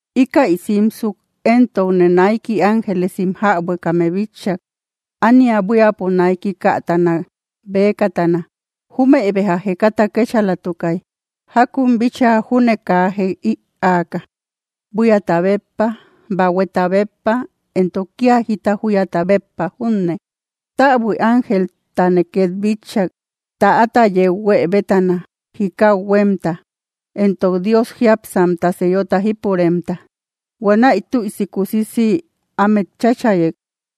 Íkäi simsuk éntokne naiki ángelesim jäbuekame bitchak, ánia buíapo naiki kätana bëkatana. Júmëi béja jekata kétchalatukay, jákun bíchaa junne, kaa jek ïaaka, buíata béppa, bahueta béppa, entok kía jita júyata béppa junne. Täbui ángeltane ket bitchak, täata yeu huë bétana, jikau huémta, entok Dios jiápsamta sellota jípuremta. Huanäi tüisi kusisi ámet cháchayek,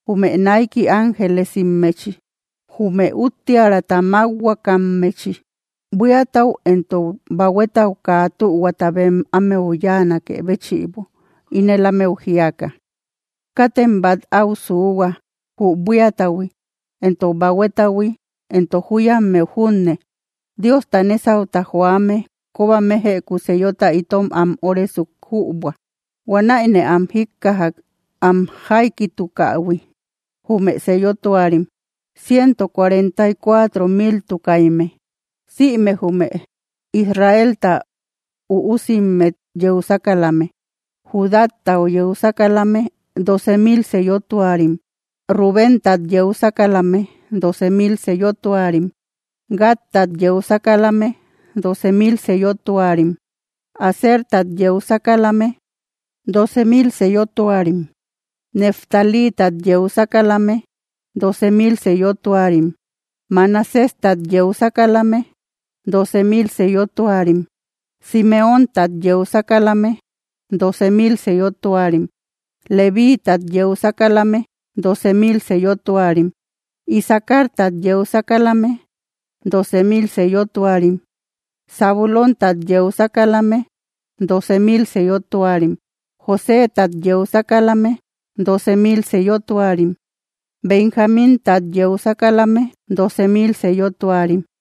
jume naiki ángelesimmechi, jume úttiärata mákhuakammechi, buíatau entok bahuetau kaa tühuata bem ámeu yáanakë béchïbo, ínel ámeu jíaka: —Kátem bát áu suuhua, jü buíatahui entok bahuetahui entok júyammeu junne, Diosta nésauta joame kóba méjëku sellota itom am óresuk jübua. Huanäine am jíkkajak, am jaikitukähui, jume sellotuarim: ciento cuarenta y cuatro miltukaimme, sïme jume Israelta üusimmet yeu sákalame. Judátat yeu sákalame, dóoce mil sellotuarim; Rubéntat yeu sákalame, dóoce mil sellotuarim; Gadtat yeu sákalame, dóoce mil sellotuarim; Asertat yeu sákalame, dóoce mil sellotuarim; Neftalítat yeu sákalame, dóoce mil sellotuarim; Manaséstat yeu sákalame, dóoce mil sellotuarim; Simeóntat yeu sákalame, dóoce mil sellotuarim; Levíitat yeu sákalame, dóoce mil sellotuarim; Isacartat yeu sákalame, dóoce mil sellotuarim; Zabulóntat yeu sákalame, dóoce mil sellotuarim; Josétat yeu sákalame, dóoce mil sellotuarim; Benjamíntat yeu sákalame, dóoce mil sellotuarim.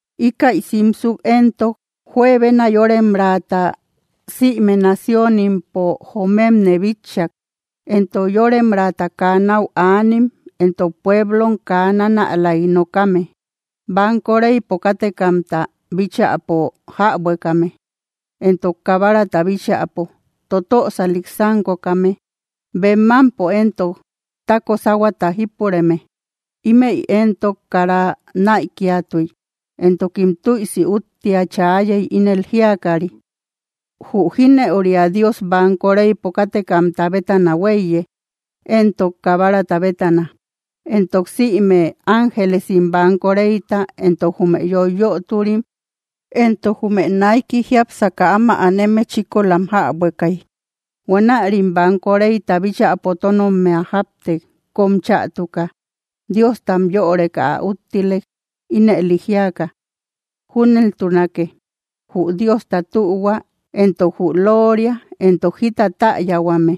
Íkäi simsuk éntok, juebena yóremraata sïme naciónimpo jomemne bitchak, entok yóremraata kaa náu anim entok pueblom kaa nánälaik nokame, banko reypo kátekamta bíchäpo jäbuekame, entok Kabarata bíchäpo, totösalik sánkokame, bem mámpo éntok tako sáhuata jípureme. Ímëi éntok kara näikiatuy. Entokim tüisi úttia chaayey, ínel jíakari: ¡Jü jínëuria Dios banko reypo kátekamta bétana huéiye, entok Kabarata bétana! Entok sïme ángelesim banko reyta, entok jume yoiyöturim, entok jume naiki jiápsaka áma aneme, chíkolam jäbuekay. Huanärim banko reyta bíchäpo tónommia jáptek, kóm chätuka. Diostam yöreka ä úttilek, ínëli jíaka: ¡Júneltunake! ¡Jü Diosta tühua, entok jü looria, entok jita täyahuame,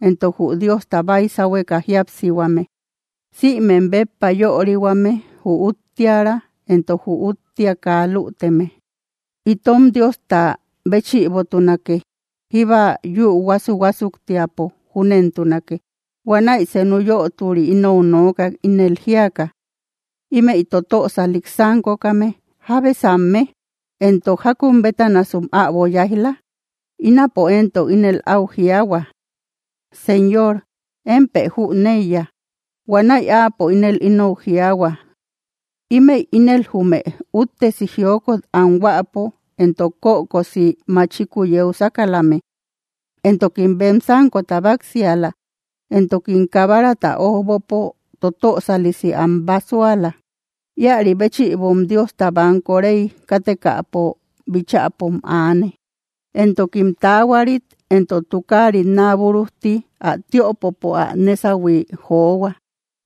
entok jü Diosta baysahueka jíapsihuame, sïmem béppa yörihuame, jü úttiära, entok jü úttia kaa lüteme, itom Diosta béchïbotunake, jíba yü huásu‑huásuktiapo! ¡Júnentunake! Huanäi senu yöturi inou nookak, ínel jíaka: —Ímëi totösalik sánkokame, ¿jábesamme? Entok, ¿jákun bétanasum äbo yáij‑la? Ínapo éntok ínel áu jiaahua: —Señor, émpë jüneiya. Huanäi áapo ínel inou jiaahua: —Ímëi ínel jume úttesi jiokot anhuäpo entok kökosi machikuu yeu sákalame, entokim bem sánkota báksiala, entokim Kabarata ójbopo totösalisi am básuala. Íäri béchïbom Diosta banko rey kátekamta bíchäpom aane. Entokim taahuarit entok tukaarit naa búrujti ä tiöpopo ä nésahui johua.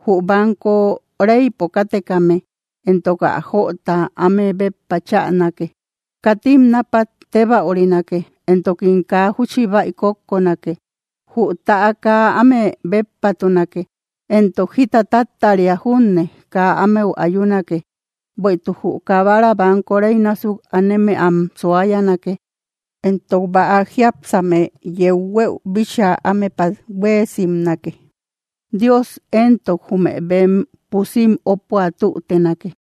Jü banko reypo kátekame éntok ä jöota áme béppa cháanake. Katim napat tébäurinake, entokim kaa júchi bäi kókkonake. Jü täa kaa áme béppatunake, entok jita táttaria júne kaa ámeu ayunake. Bueïtuk jü Kabara banko rey násuk aneme am suayanake, entok bäa jiápsame yeu huëu bíchaa ámepat huéesimnake. Dios éntok jume bem pusim ópua tútenake.